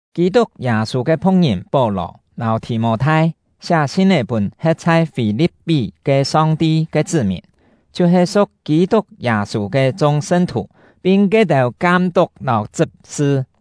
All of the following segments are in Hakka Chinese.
Kî-tuk Yâ-sû ke phu̍k-ngìn Pó-lò lâu Thì-mô-thai siá sin-é pûn he̍t chhai Fî-li̍p-pí ke Song-ti ke chṳ́-mìn, chhiu-he su̍k Kî-tuk Yâ-sû ke chung sṳn-thù, pin ke-têu kam-tuk lâu chṳp-sṳ.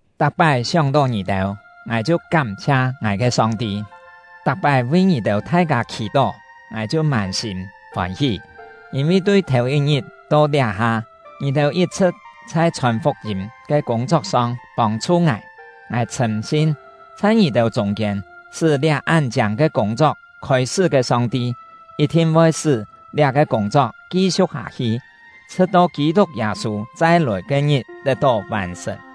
Tak-pái sióng-tó ngì-têu, ngài chhiu kám-chhia ngài ke Song-ti, tak-pái vi ngì thai-kâ khì-tó, ngài chhiu mân-sîm fôn-hí; yîn-vi tui thèu-yit-ngit to liá-ha, ngì-têu yit-chhṳ̍t chhai chhòn fuk-yîm ke kûng-chok-song pông-chhu ngài. Ngài chhṳ̂m-sin, chhai ngì-têu chûng-kiên sṳ́ liá án chiâng ke kûng-chok khôi-sṳ́ ke Song-ti, yit-thin voi sṳ́ liá-ke kûng-chok ki-siu̍k hâ-hi, chhṳ̍t-to Kî-tuk Yâ-sû chai-lòi ke-ngit tet-tó vàn-sṳ̀n.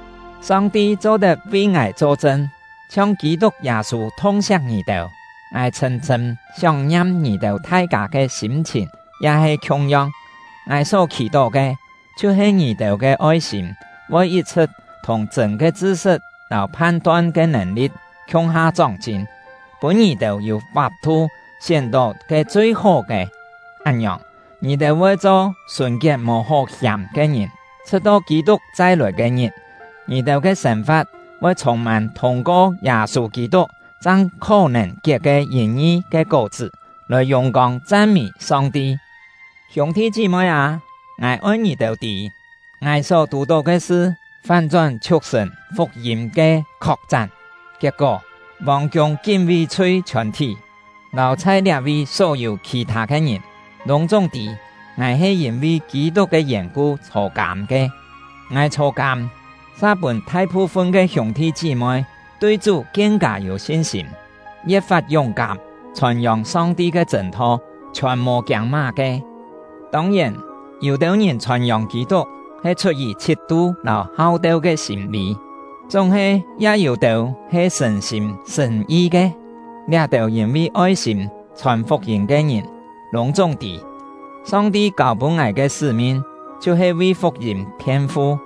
Song-ti cho-tet vi ngài cho-chṳn: Chhiong Kî-tuk Yâ-sû thung-siak ngì-têu, ngài chhṳ̂m-chhṳ̂m sióng-ngiam ngì-têu thai-kâ ke sîm-chhìn ya he khiung-yong! Ngài só khì-tó ke chhiu-he ngì-têu ke oi-sîm voi yit-chhṳ̍t thùng chṳ̂n ke chṳ-sṳt lâu phan-ton ke nèn-li̍t khiung-ha chóng-chin, pûn ngì-têu yû fap-thu sién-tó ke chui-hó ke. Án-ngiòng, ngì-têu voi cho sùn-kiet mò hó hiàm ke ngìn, chhṳ̍t-to Kî-tuk chai-lòi ke-ngit. Ngì-têu ke sên-fa̍t voi chhûng-mân thûng-ko Yâ-sû Kî-tuk chang khó-nèn kiet ke yìn-ngi ke kó-chṳ́, lòi yùng-kông chan-mî Song-ti. Hiûng-thi chí-moi â, ngài oi ngì-têu tî, ngài só tù-tó ke sṳ fán-chón chhiuk-sṳ̀n fuk-yîm ke khok-chán. Kiet-kó, vòng-kiûng kín-ví-chhui chhiòn-thí, lâu chhai liá-vi só-yû khì-thâ ke ngìn, lûng-chúng tî ngài he yîn-vi Kî-tuk ke yèn-ku chhô-kâm ke. Ngài chhô-kâm, sa pûn thai-phu-fun ke hiûng-thi chí-moi tui Chú kien-kâ yû sin-sîm, ye̍t-fat yúng-kám chhòn-yòng Song-ti ke chṳ̂n-tho, chhiòn mò kiâng má-ke. Tông-yèn, yû-têu ngìn chhòn-yòng Kî-tuk he chhut-yì chhit-tu lâu hau-teu ke sîm-lî, chúng-he ya yû-têu he sṳ̀n-sîm sṳ̀n-yi ke. Liá-têu yîn-vi oi-sîm chhòn fuk-yîm ke ngìn lûng-chúng tî, Song-ti kâu-pûn ngài ke sṳ́-min chhiu-he vi fuk-yîm phien-fu.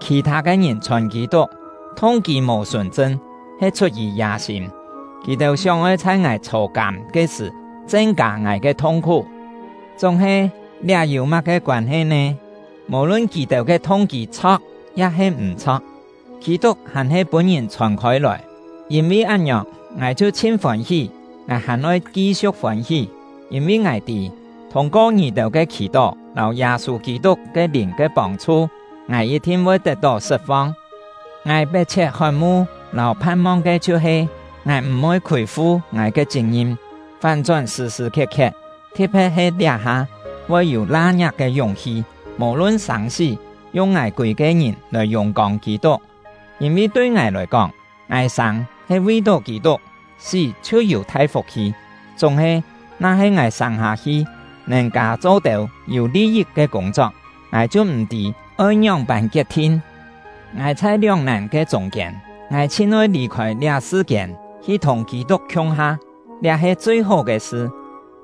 Khì-thâ ke ngìn chhòn Kî-tuk, thung-kî mò sùn-chṳn, he chhut-yì yâ-sîm; kì-têu sióng-oi chhai ngài chhô-kâm ke sṳ̀ chen-kâ ngài ke thung-khú. Chúng-he, liá yû má-ke koân-he nè? Mò-lun kì-têu ke thung-kî chho̍k ya-he m̀-chho̍k, Kî-tuk hàn-he pûn-ngìn chhòn khôi-lòi. Yîn-vi án-ngiòng, ngài chhiu chhin fôn-hí. Ngài hàn oi ki-siu̍k fôn-hí; yîn-vi ngài tî, thûng-ko ngì-têu ke khì-tó lâu Yâ-sû Kî-tuk ke Lìn ke pông-chhu, ngài yit-thin voi tet-tó sṳt-fong. Ngài pet-chhiet hot-mu lâu phan-mong ke chhiu-he: Ngài m̀-voi khûi-fu ngài ke chit-ngim, fán-chón sṳ̀-sṳ̀ khiet-khiet, thi̍t-phe̍t he liá-ha, voi yû la-ngiak ke yúng-hi, mò-lun sâng-sí, yung ngài kûi-ke ngìn lòi yùng-kông Kî-tuk. Yîn-vi tui ngài lòi kóng, ngài sâng he vi-tó Kî-tuk, sí chhiu yû thai fuk-hi! Chúng-he, na-he ngài sâng-hâ-hi nèn kâ cho têu yû li-yit ke kûng-chok, ngài chhiu m̀-tî oi ngióng-pân kiet-thin. Ngài chhai lióng-nàn ke chûng-kiên: Ngài chhin oi lì-khôi liá sṳ-kiên, hi thùng Kî-tuk khiung-ha, liá he chui-hó ke sṳ;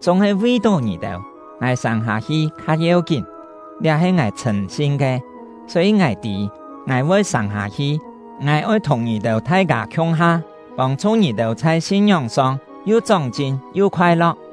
chúng-he vi-tó ngì-têu, ngài sâng-hâ-hi kha yeu-kín. Liá he ngài chhṳ̂m-sin ke, só-yî ngài tî ngài voi sâng-hâ-hi. Ngài oi thùng ngì-têu thai-kâ khiung-ha, pông-chhu ngì-têu chhai sin-ngióng-song yu chóng-chin yu khoai-lo̍k,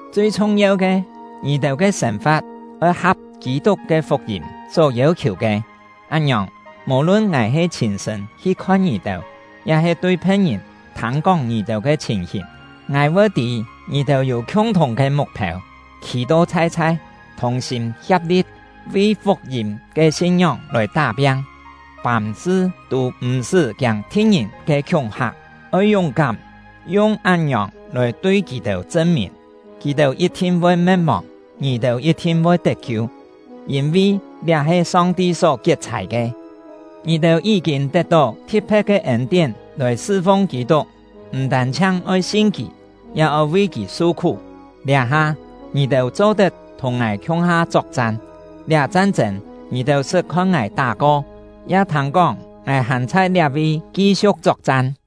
Chui chhung-yeu ke, ngì-têu ke sên-fa̍t oi ha̍p Kî-tuk ke fuk-yîm só yêu-khiù ke. Án-ngiòng, mò-lun ngài he chhîn-sṳ̂n hi khon ngì-têu, ya-he tui phe̍t-ngìn thâng-kóng ngì-têu ke chhìn-hìn, ngài voi tî ngì-têu yû khiung-thùng ke muk-phêu, khî-to chhai-chhai, thùng-sîm hia̍p-li̍t vi fuk-yîm ke sin-ngióng lòi tá-piang. Fàm-sṳ tû m̀-sṳ́ kiâng thi̍t-ngìn ke khiúng-hak; oi yúng-kám, yung án-ngiòng lòi tui kì-têu chṳn-mìn, kì-têu yit-thin voi me̍t-mòng, ngì-têu yit-thin voi tet-kiu “me̍t-mòng... tet-kiu” ya-he yi̍t-cho “sṳt-phai... tet-sṳn”., yîn-vi liá he Song-ti só kiet-chhài ke. Ngì-têu yí-kîn tet-tó thi̍t-phe̍t ke ên-tién lòi sṳ-fung Kî-tuk, m̀ tân-chhiang oi sin kì, ya oi vi kì su-khú. Liá-ha, ngì-têu cho-tet thùng ngài khiung-ha chok-chan; liá chan-chên ngì-têu sṳt khon ngài tá-ko, ya thâng-kóng ngài hàn chhai liá-vi ki-siu̍k chok-chan.